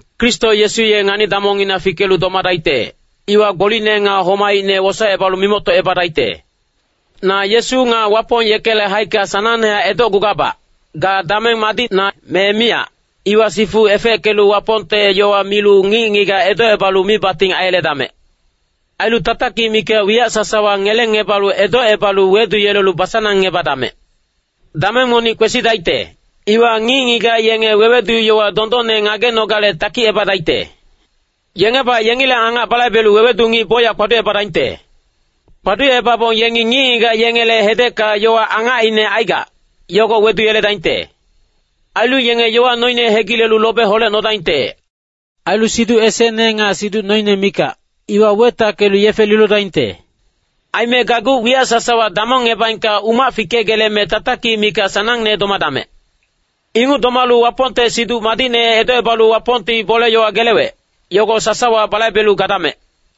Kristo Yesu ye ngani-damongngina fikelu domadaicte, iwa gbolicne nga homaicne wosaecebalu mimoctocebadaicte. Na Yesu nga Wapong yekele haicka sanangnehac edocgugabac. Ga dameng madicna, me miyac, iwa sifu efeckelu Wapongte yowa milu ngic-ngigac edocebalu mibating aiyeledamec. Ailu tatakic mikac wiyac sasawa ngelengebalu edocebalu weduyelelu basanangebadamec. Dameng monic kwesidaicte, iwa ngic-ngigac yenge wewedu-yowa dondonne ngagenogale takicebadaicte. Yengebac yengileng angac balaibelu wewedu ngic bocyac kpaducebadaingte. Kpaducebabong yengi ngic-ngigac yengele hedecka yowa angacine aigac, yogo weduyeledaingte. Ailu yenge yowa noine hegilelu lobe holecnodaingte. Ailu siduc esecne nga siduc noine mikac, iwa wetackelu yefe lilodaingte. Aime gageuc wiyac sasawa damongebaengka umac fikegeleme tatakic mikac sanangne domadamec. Inguc domalu Wapongte Siduc Madicne edocebalu Wapongti bole-yowa gelewec, yogo sasawa balaibelu gadamec.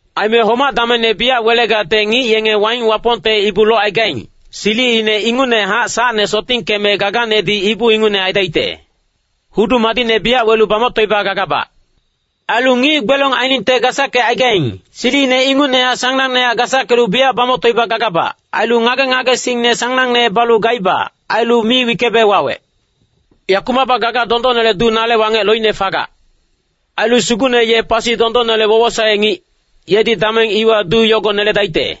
Aime homac-damengne biyac welegacte ngic yenge waing Wapongte ibu locaigaing, silicine ingucnehac sacne sotingkeme gaganedi ibu ingucne aidaicte. Hudu madicne biyac welu bamoctoiba gagabac. Ailu ngic gbelong ainingte gasackecaigaing, silicine ingucnehac sanangnehac gasackelu biyac bamoctoiba gagabac. Ailu ngage-ngagesingne sanangne balu gaiba. Ailu mi wickebe wawec. Yakumacbac gaga dondonnele duu nale wangec loicne fagac. Ailu Sugucne ye pasi dondonnele wowosae-ngic, yedi dameng iwa duu yogo neledaicte.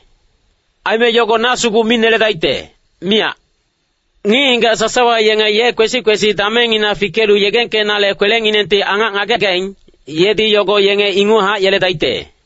Aime yogo na sugu mi neledaicte, miyac. Ngic-ngigac sasawa yenge ye kwesi-kwesi damengngina fikelu yegengkenale kwelenginengti angac ngagegaing, yedi yogo yenge inguchac yeledaicte.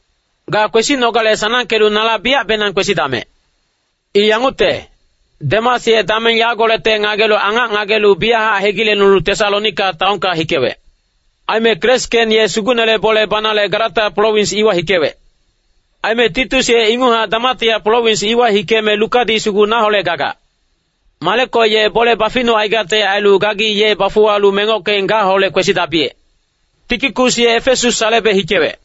Ga kwesinogale sanangkelu nala biyacbenang kwesidamec. I yangucte, Demas ye dameng yagolecte gagale angac ngagelu biyachac hegilecnulu Tesalonika taonka hikewec. Aime Keresken ye Sugucnele bole banale Galata prowins iwa hikewec. Aime Titus ye inguchac Damatia prowins iwa hikeme Lukadi sugu naholec gagac. Mareko ye bole baficnucaigacte ailu gagi ye bafuwalu mengockeng gaholec kwesidabiyec. Tikikus ye Efesas salebe hikewec.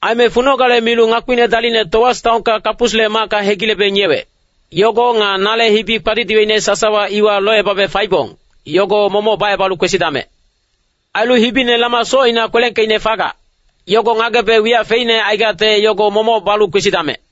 Aime funogale milu ngakpine dalicne Toas taonka Kapusle macka hegilebe ngiyewec, yogo nga nale hibi kpadidiweicne sasawa iwa locebabe faibong, yogo momoc bacebalu kwesidamec. Ailu hibine lama socina kwelengkeicne fagac, yogo ngagebe wiyac feicne aigacte yogo momoc balu kwesidamec.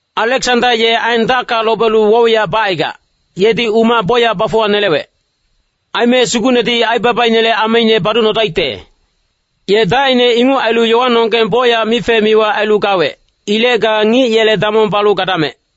Aleksanda ye aen dacka lobelu woc-wiyac bacaigac, yedi umac bocyac bafuwanelewec. Aime Sugucnedi aibabainele ameine baducnodaicte. Ye dacine inguc ailu yowanonggeng bocyac mife-miwa ailu gawec. Ilec ga ngic yele damong balu gadamec.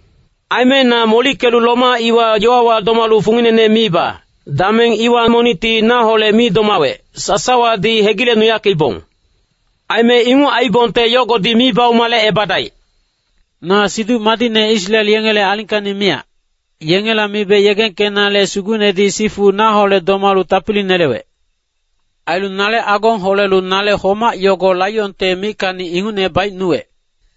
Aime na molickelu Roma iwa yowawa domalu funginene miiba, dameng iwa monicti naholec mi domawec, sasawadi hegilecnuyackeibong. Aime inguc aiibongte yogodi mi baumalecebadaic. Na Siduc Madicne Israel yengele alingkacni miyac, yengela mibe yegengkenale Sugucnedi sifu naholec domalu tapili nelewec. Ailu nale agong holelu nale homac yogo laionte mickacni ingucne baicnuwec.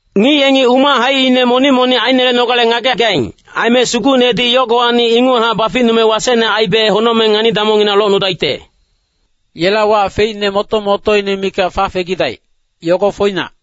Ngic yengi umac haicine monic-monic ainelenogale ngagegaing. Aime Sugucnedi yogowacni inguchac baficnume wasecne aibe honocmeng ngani-damongngina locnudaicte. Yela wac feicne moto-motoine mikac fafegidaic, yogo foinac.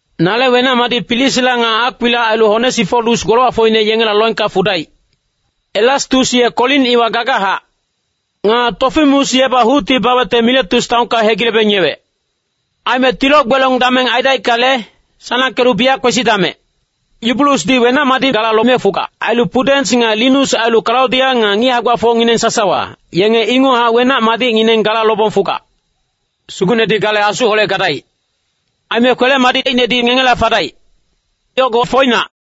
Nale wenac-madic Prisila nga Akwila ailu Onesiforus golowacfocine yengela loengka hikedaic. Erastus ye Korin iwa gagachac. Nga Tofimus yebac hucti bawecte Miletus taonka hegilebe ngiyewec. Aime tilo-gbelong dameng aidaickale, sanangkelu biyac kwesidamec. Yubulusdi wenac-madic gala lome fugac. Ailu Pudens nga Linus ailu Kalaudia nga ngic hae-gbafocnonggeng sasawa, yenge inguchac wenac-madicngineng gala lobong fugac. Sugucnedi gale asuholec gadaic. Aime kwele-madicinedi ngengela fadaic. Yogo foinac.